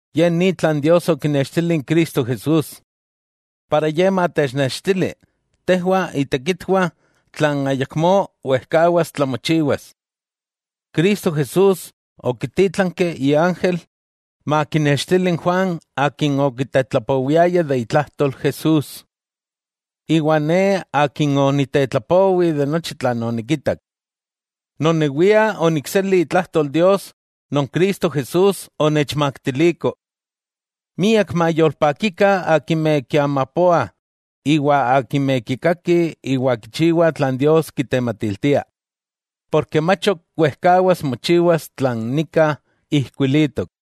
Ye ni tlan Dios okinextili n Cristo Jesús, iwa ijkó matechnextili tejwah itekitwah tlan ayakmó wejkawas tlamochiwas. Cristo Jesús okitítlanki iángel makinextili n Juan akin okitetlapowiaya de itlajtol Jesús. Iwa ne akin oniktelapowi nochi tlan onikitak. Nonewia onikseli itlajtol Dios non Cristo Jesús onechmaktiliko. Miak mayolpakikah akimeh kiamapoah iwa akimeh kikakih iwa kichiwah tlan Dios kitematiltia, porke mach ok wejkawas mochiwas tlan nika ijkuilitok.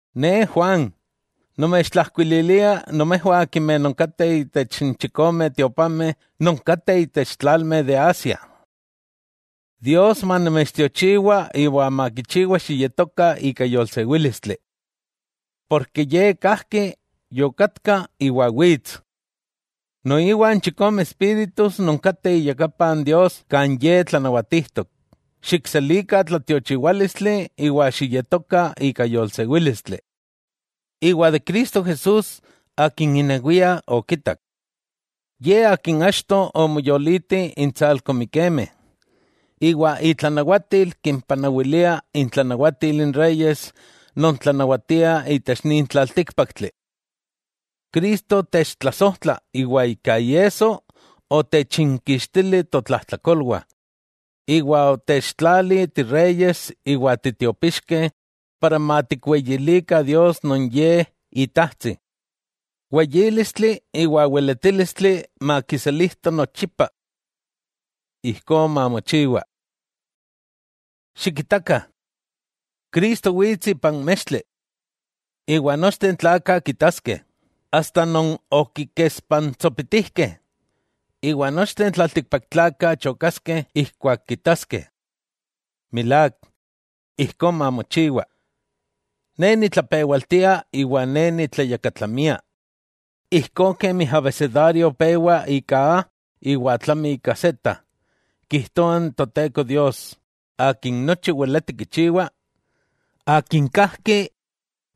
Ne Juan, nomechtlajkuililia nomejwah akimeh nonkateh intech n chikome tiopanmeh non kateh itech n tlalmeh de Asia. Dios manomechtiochiwa iwa makichiwa xiyetokah ika yolsewílistli, porke Ye kajki, yokatka iwa wits. Noiwa n chikome espíritus non kateh iyakapa n Dios kan Ye tlanawatijtok, xikselikah tlatiochiwálistli iwa xiyetokah ika yolsewílistli iwa de Cristo Jesús Akin inewia okitak. Ye akin achto omoyoliti intsalko mikemeh, iwa itlanawatil kimpanawilia intlanawatil n reyes non tlanawatiah itech nin tlaltíkpaktli. Cristo techtlasojtla iwa ika iesso otechinkixtili totlajtlakolwah, iwa otechtlali tireyes iwa titiopixkeh para matikweyilikah Dios non Ye Itajtsi. ¡Weyílistli iwa weletílistli makiselijto nochipa! Ijkó mamochiwa. Xikitakah. Cristo wits ipan mextli. Iwa nochteh n tlakah kitaskeh, asta non okikespantsopitijkeh; iwa nochteh n tlaltikpaktlakah chokaskeh ijkuak kitaskeh. Milák, ijkó mamochiwa. Ne nitlapewaltia iwa ne nitlayakatlamia, (ijkó kemi abesedario pewa ika A iwa tlami ika Z,) kijtoa n Toteko Dios Akin nochi weleti kichiwa, Akin kajki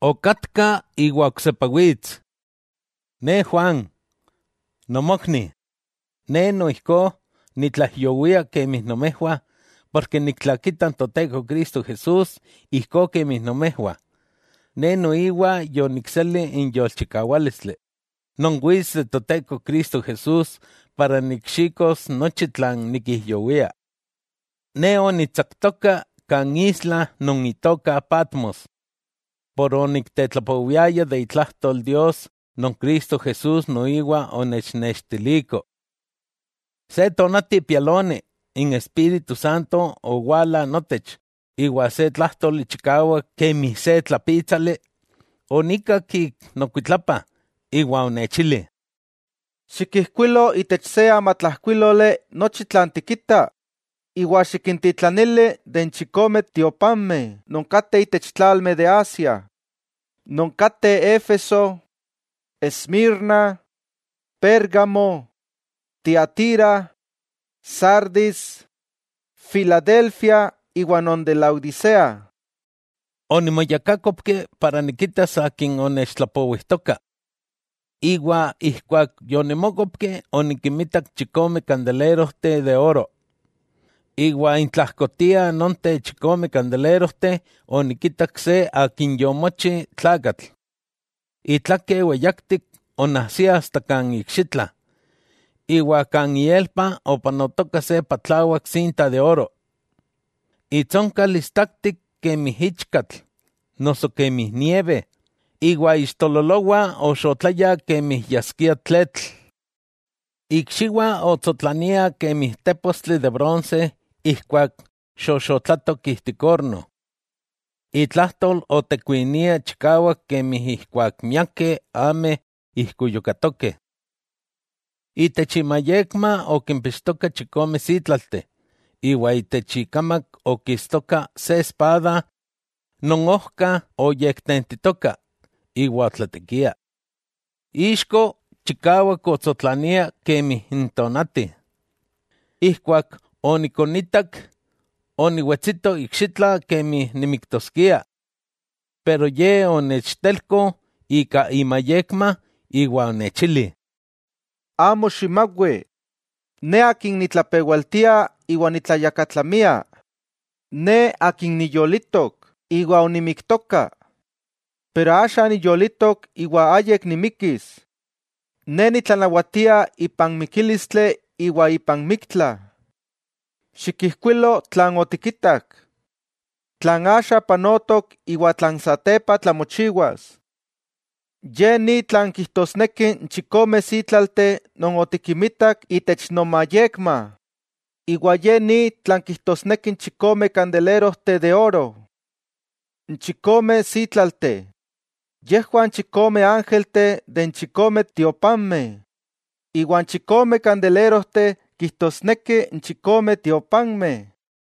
okatka iwa oksepa wits. Ne Juan, nomokni, ne noijkó nitlaijyowia kemi nomejwah ken niktlakita n Toteko Cristo Jesús ijkó kemi nomejwah ne noiwa yonikseli n yolchikawálistli non wits de Toteko Cristo Jesús para nikxikos nochi tlan nikijyowia. Ne onitsaktoka kan isla non itoka Patmos por oniktetlapowiaya itlajtol Dios non Cristo Jesús noiwa onechnextiliko. Se tonati pialoni, n Espíritu Santo owala notech iwa se tlájtoli chikawak kemi se tlapítsali, onikak ik nokuitlapa iwa onechili: —Xikijkuilo itech se amatlajkuíloli nochi tlan tikita iwa xikintitlanili n chikome tiopanmeh non kateh itech tlalmeh de Asia, non kateh Éfeso, Esmirna, Pérgamo, Tiatira, Sardis, Filadelfia iwa non de Laodisea. Onimoyakákopki para nikitas akin onechtlapowijtoka iwa ijkuak yonimókopki onikinmitak chikome kandelerojteh de oro. Iwa intlajkotiah nonteh chikome kandelerojteh onikitak se Akin yomochi tlakatl, itlake weyaktik onajsia asta kan ikxitla, iwa kan ielpa opanotoka se patlawak sinta de oro. Itsonkal istaktik kemi ichkatl noso kemi nieve, iwa ixtololowah oxotlayah kemi yaskia tletl. Ikxiwah otsotlaniah kemi tépostli de bronse ijkuak xoxotlatok ijtik orno, itlajtol otekuinia chikawak kemi ijkuak miakeh ameh ijkuyukatokeh. Itech imayekma okimpixtoka chikome sítlalteh, iwa itech ikamak okistoka se espada non ojka oyektentitoka iwa otlatekia. Ixko chikawak otsotlania kemi n tonati. Ijkuak onikonitak, oniwetsito ikxitla kemi nimiktoskia. Pero Ye onechtelko ika imayekma, iwa onechili: —Amo ximawi. Ne Akin nitlapewaltia iwa nitlayakatlamia. Ne Akin niyolitok; iwa onimiktoka, pero axa niyolitok iwa ayik nimikis. Ne nitlanawatia ipan mikílistli iwa ipan miktla. Xikijkuilo tlan otikitak, tlan axa panotok iwa tlan satepa tlamochiwas. Ye ni tlan kijtosneki n chikome sítlalteh non otikinmitak itech nomayekma, iwa ye ni tlan kijtosneki n chikome kandelerojteh de oro: n chikome sítlalteh, yejwah n chikome ángelteh de n chikome tiopanmeh, iwa n chikome kandelerojteh kijtosneki n chikome tiopanmeh.